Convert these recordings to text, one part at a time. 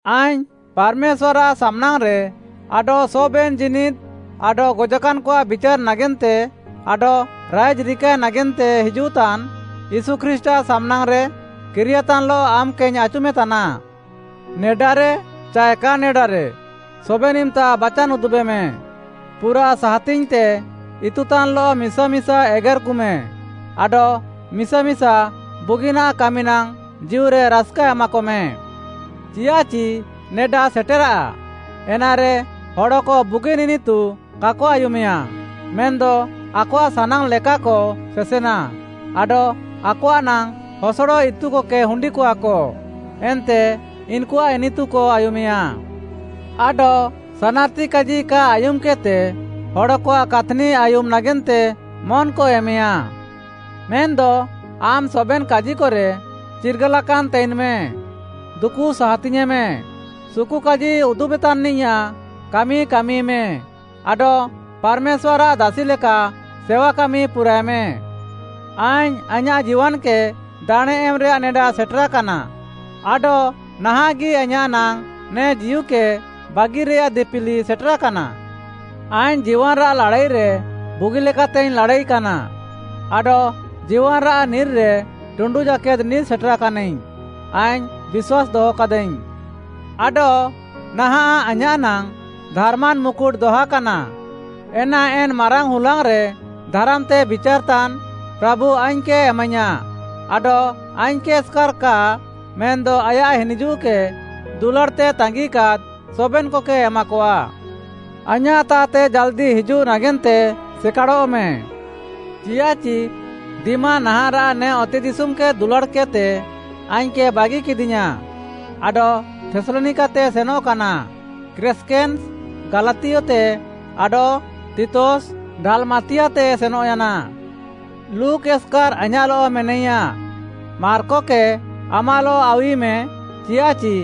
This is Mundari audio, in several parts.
ଆଇଙ୍ଗ୍‌ ପାର୍‌ମେଶ୍ୱାର୍‌ଆଃ ସାମ୍‌ନାଙ୍ଗ୍‌ରେ ଆଡଃ ସବେନ୍‌ ଜୀନିଦ୍‌ ଆଡଃ ଗଜାକାନ୍‌କଆଃ ବିଚାର୍‌ ନାଗେନ୍ତେ ଆଡଃ ରାଇଜ୍‌ ରିକାଏ ନାଗେନ୍ତେ ହିଜୁଃତାନ୍‌ ୟୀଶୁ ଖ୍ରୀଷ୍ଟ୍‌ଆଃ ସାମ୍‌ନାଙ୍ଗ୍‌ରେ କିରିୟାତାନ୍‌ଲଃ ଆମ୍‌କେଇଙ୍ଗ୍‌ ଆଚୁମେତାନା। ନେଡାରେ ଚାଏ କା ନେଡାରେ ସବେନ୍‌ ଇମ୍‌ତା ବାଚାନ୍‌ ଉଦୁବେମେ, ପୁରାଃ ସାହାତିଙ୍ଗ୍‌ତେ ଇତୁତାନ୍‌ଲଃ ମିସା ମିସା ଏଗେର୍‌କୁମେ ଆଡଃ ମିସା ମିସା ବୁଗିନାଃ କାମିନାଙ୍ଗ୍‌ ଜୀଉରେ ରାସ୍‌କା ଏମାକମେ। ଚିୟାଃଚି ନେଡା ସେଟେରାଃ, ଏନାରେ ହଡ଼କ ବୁଗିନ୍‌ ଇନିତୁ କାକ ଆୟୁମେୟା, ମେନ୍‌ଦ ଆକଆଃ ସାନାଙ୍ଗ୍‌ଲେକାକ ସେସେନା ଆଡଃ ଆକଆଃ ନାଙ୍ଗ୍‌ ହସଡ଼ ଇତୁକକେ ହୁଣ୍ଡିକଆକ, ଏନ୍ତେ ଇନ୍‌କୁଆଃ ଇନିତୁକ ଆୟୁମେୟା। ଆଡଃ ସାନାର୍‌ତି କାଜି କା ଆୟୁମ୍‌କେଦ୍‌ତେ ହଡ଼କଆଃ କାଥ୍‌ନି ଆୟୁମ୍‌ ନାଗେନ୍ତେ ମନ୍‌କ ଏମେୟା। ମେନ୍‌ଦ ଆମ୍‌ ସବେନ୍‌ କାଜିକରେ ଚିର୍ଗାଲାକାନ୍ ତାଇନ୍‍ମେ, ଦୁକୁ ସାହାତିଙ୍ଗ୍‌ୟେଁମେ, ସୁକୁକାଜି ଉଦୁବ୍‍ତାନ୍‌ନିଆଃ କାମି କାମିମେ, ଆଡଃ ପାର୍‌ମେଶ୍ୱାର୍‌ଆଃ ଦାସିଲେକା ସେୱାକାମି ପୁରାଏମେ। ଆଇଙ୍ଗ୍‌ ଆଇଁୟାଃ ଜୀୱାନ୍‌କେ ଦାଣେଁ ଏମ୍‌ରେୟାଃ ନେଡା ସେଟେରାକାନା, ଆଡଃ ନାହାଁଃଗି ଆଇଁୟାଃ ନାଙ୍ଗ୍‌ ନେ ଜୀଉକେ ବାଗିରେଆଃ ଦିପିଲି ସେଟେରାକାନା। ଆଇଙ୍ଗ୍‌ ଜୀୱାନ୍‌ରାଃ ଲାଡ଼ାଇରେ ବୁଗିଲେକାତେଇଙ୍ଗ୍‌ ଲାଡ଼ାଇକାନା, ଆଡଃ ଜୀୱାନ୍‌ରାଃ ନିର୍‌ରେ ଟୁଣ୍ଡୁ ଜାକେଦ୍‌ ନିର୍‌ ସେଟେରାକାନିଙ୍ଗ୍‌, ଆଇଙ୍ଗ୍‌ ବିଶ୍ୱାସ୍‌ ଦହକାଦାଇଙ୍ଗ୍‌। ଆଡଃ ନାହାଁଃ ଆଇଁୟାଃ ନାଙ୍ଗ୍‌ ଧାର୍‌ମାନ୍‌ ମୁକୁଟ୍‌ ଦହାକାନା, ଏନା ଏନ୍‌ ମାରାଙ୍ଗ୍‌ ହୁଲାଙ୍ଗ୍‌ରେ ଧାରାମ୍‌ତେ ବିଚାର୍‌ତାନ୍‌ ପ୍ରାଭୁ ଆଇଙ୍ଗ୍‌କେ ଏମାଇୟାଁ ଆଡଃ ଆଇଙ୍ଗ୍‌କେ ଏସ୍‍କାର୍‌ କା ମେନ୍‌ଦ ଆୟାଃ ହିନିଜୁଃକେ ଦୁଲାଡ଼୍‌ତେ ତାଙ୍ଗିକାଦ୍‌ ସବେନ୍‌କକେ ଏମାକଆ। ଆଇଁୟାଃତାଃତେ ଜାଲ୍‌ଦି ହିଜୁଃ ନାଗେନ୍ତେ ସେକାଡ଼ଃମେ। ଚିୟାଃଚି ଦିମା ନାହାଁଃରାଃ ନେ ଅତେଦିଶୁମ୍‌କେ ଦୁଲାଡ଼୍‌କେଦ୍‍ତେ ଆଇଙ୍ଗ୍‌କେ ବାଗିକେଦିୟାଁ ଆଡଃ ଥେସ୍‌ଲନିକାତେ ସେନଃକାନା। କ୍ରେସ୍‌କେନ୍‌ସ୍‌, ଗାଲାତିୟତେ ଆଡଃ ତିତସ୍‌, ଡାଲ୍‍ମାତିଆତେ ସେନଃୟାନା। ଲୁକ୍‌ ଏସ୍‍କାର୍ ଆଇଁୟାଃଲଃ ମେନାଇୟା। ମାର୍କକେ ଆମାଃଲଃ ଆଉୱିମେ, ଚିୟାଃଚି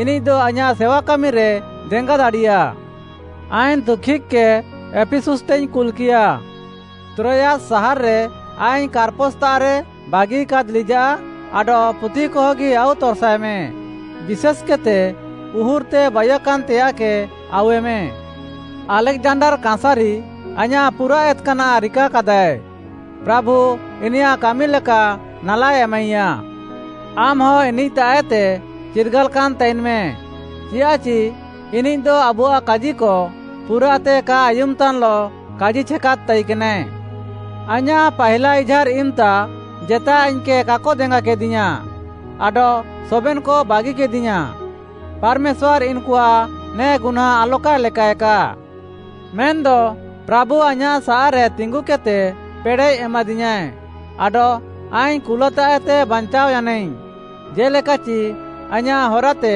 ଇନିଃଦ ଆଇଁୟାଃ ସେୱା କାମିରେ ଦେଙ୍ଗା ଦାଡ଼ିୟା। ଆଇଙ୍ଗ୍‌ ତୁଖିକ୍‌କେ ଏଫିସୁସ୍‌ତେଇଙ୍ଗ୍‌ କୁଲ୍‍କିୟା। ତ୍ରୋୟାସ୍‌ ସାହାର୍‌ରେ ଆଇଙ୍ଗ୍‌ କାର୍‌ପସ୍‌ତାଃରେ ବାଗିକାଦ୍ ଲିଜାଃ ଆଡଃ ପୁଥିକହଗି ଆଉତର୍‌ସାଏମେ, ବିଶେଷ୍‌କେଦ୍‌ତେ ଉହୁର୍‌ତେ ବାଇୟାକାନ୍‌ତେୟାଃକେ ଆଉୱେମେ। ଆଲେକ୍‌ଜାଣ୍ଡାର୍‌ କାଁସାରି ଆଇଁୟାଃ ପୁରାଃ ଏତ୍‍କାନାଃ ରିକାକାଦାଏ, ପ୍ରାଭୁ ଇନିୟାଃ କାମିଲେକା ନାଲା ଏମାଇୟାଏ। ଆମ୍‌ହ ଇନିଃତାଃଏତେ ଚିର୍ଗାଲାକାନ୍‍ ତାଇନ୍‌ମେ, ଚିୟାଃଚି ଇନିଃଦ ଆବୁଆଃ କାଜିକ ପୁରାଃତେ କା ଆୟୁମ୍‌ତାନ୍‌ଲଃ କାଜିଛେକାଦ୍‌ ତାଇକେନାଏ। ଆଇଁୟାଃ ପାହିଲା ଇଝାର୍‌ ଇମ୍‌ତା ଜେତାଏ ଆଇଙ୍ଗ୍‌କେ କାକ ଦେଙ୍ଗାକେଦିୟାଁ, ଆଡଃ ସବେନ୍‌କ ବାଗିକେଦିୟାଁ। ପାର୍‌ମେଶ୍ୱାର୍‌ ଇନ୍‌କୁଆଃ ନେ ଗୁହ୍ନାଁ ଆଲକାଏ ଲେକାଏକା। ମେନ୍‌ଦ ପ୍ରାଭୁ ଆଇଁୟାଃସାଃରେ ତିଙ୍ଗୁକେଦ୍‌ତେ ପେଡ଼େଃ ଏମାଦିୟାଁଏ, ଆଡଃ ଆଇଙ୍ଗ୍‌ କୁଲାତାଃଏତେ ବାଞ୍ଚାଅୟାନାଇଙ୍ଗ୍‌, ଜେ'ଲେକାଚି ଆଇଁୟାଃ ହରାତେ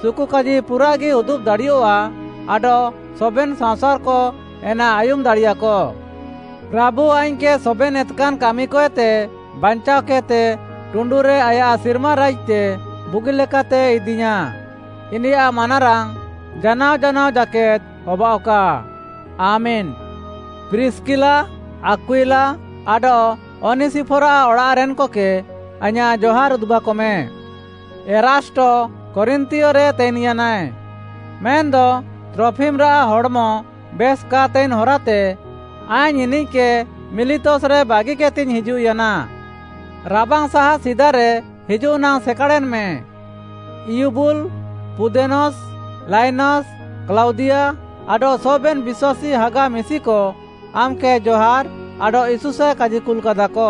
ସୁକୁକାଜି ପୁରାଃଗି ଉଦୁବ୍‌ ଦାଡ଼ିୟଃଆ ଆଡଃ ସବେନ୍‌ ସାଅଁସାର୍‌କ ଏନା ଆୟୁମ୍‌ ଦାଡ଼ିୟାକ। ପ୍ରାଭୁ ଆଇଙ୍ଗ୍‌କେ ସବେନ୍‌ ଏତ୍‌କାନ୍‌ କାମିକଏତେ ବାଞ୍ଚାଅକେଦ୍‌ତେ ଟୁଣ୍ଡୁରେ ଆୟାଃ ସିର୍ମା ରାଇଜ୍‌ତେ ବୁଗିଲେକାତେ ଇଦିୟାଁ। ଇନିୟାଃ ମାନାରାଙ୍ଗ୍‌ ଜାନାଅ ଜାନାଅ ଜାକେଦ୍‌ ହବାଅଃକା! ଆମେନ୍‌। ପ୍ରିସ୍‌କିଲା, ଆକ୍ୱିଲା ଆଡଃ ଅନିସିଫର୍‌ଆଃ ଅଡ଼ାଃରେନ୍‌କକେ ଆଇଁୟାଃ ଜହାର୍‌ ଉଦୁବାକମେ। ଏରାଷ୍ଟ କରିନ୍ଥିୟରେ ତାଇନ୍‍ୟାନାଏ। ମେନ୍‌ଦ ତ୍ରଫିମ୍‌ରାଃ ହଡ଼୍‌ମ ବେଶ୍‌ କା ତାଇନ୍‌ ହରାତେ ଆଇଙ୍ଗ୍‌ ଇନିଃକେ ମିଲିତସ୍‌ରେ ବାଗିକେଦ୍‌ତେଇଙ୍ଗ୍‌ ହିଜୁଃୟାନା। ରାବାଙ୍ଗ୍‌ ସାହା ସିଦାରେ ହିଜୁଃନାଙ୍ଗ୍‌ ସେକାଡ଼େନ୍‌ମେ। ଇଉବୁଲ୍‌, ପୁଦେନସ୍‌, ଲାଇନାସ୍‌, କ୍ଲାଉଦିଆ ଆଡଃ ସବେନ୍‌ ବିଶ୍ୱାସୀ ହାଗା ମିଶିକ ଆମ୍‌କେ ଜହାର୍‌ ଆଡଃ ଇଶୁସାଏ କାଜିକୁଲ୍‌କାଦାକ।